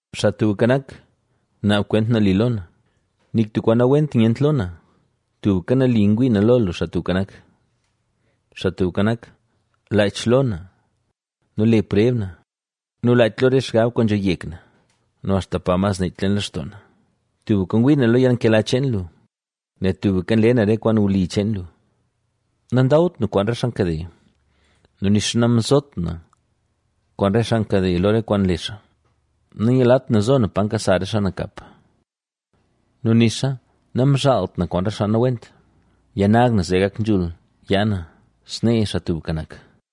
Xaa Tubka Nak, naab kwent nali lo na, nik tub kwaan nawent nyent lo na, tubka nali ngwii na lo lu, Xaa Tubka Nak. Xaa Tubka Nak, laach lo na nu le preb na, ¡Nu laach lo re xgab kwaan nzho yek na nu axta pa mas nech leen lextoo na! Tubka ngwii na lo yalnkela cheen lu, nel tubka nle na re kwaan wli cheen lu. Nandawt na kwaan re xaa nkade nu nixa namzot na kwaan re xaa nkade lo re kwaan nle xaa. Nanyulat na zo na pa nkasa re xaa nakap nu nixa namzhaalt na kwaan re xaa nawent. Yanag na zee gak nzhul yaa na, snee, Xaa Tubka Nak,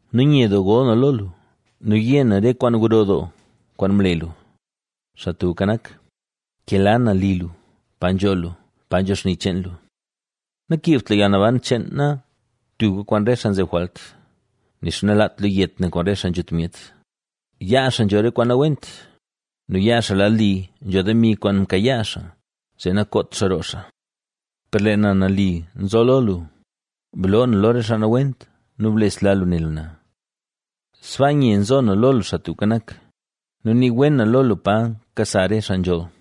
nu nye doo gol na lo lu nu yé na re kwaan gro doo, kwaan mle lu. Xaa Tubka Nak, nkela na li lu, pa nzho lu, pa nzho xni cheen lu. Nakiibt lu yalnaban cheen na tubka kwaan re xaa nzeb jwalt nixa nalaat lu yet na kwaan re xaa nzhut myet, yaa xaa nzho re kwaan nawent nu yaa xaa lad li nzho demi kwaan mkayaa xaa zee nakoot xaa roo xaa. Per lee na nali nzo lo lu, bloo na lo re xaa nawent nu blesla lu ne lu na. Sbaa nye nzo na lo lu Xaa Tubka Nak, nu nii wen na lo lu pa nkasa re xaa nzholl.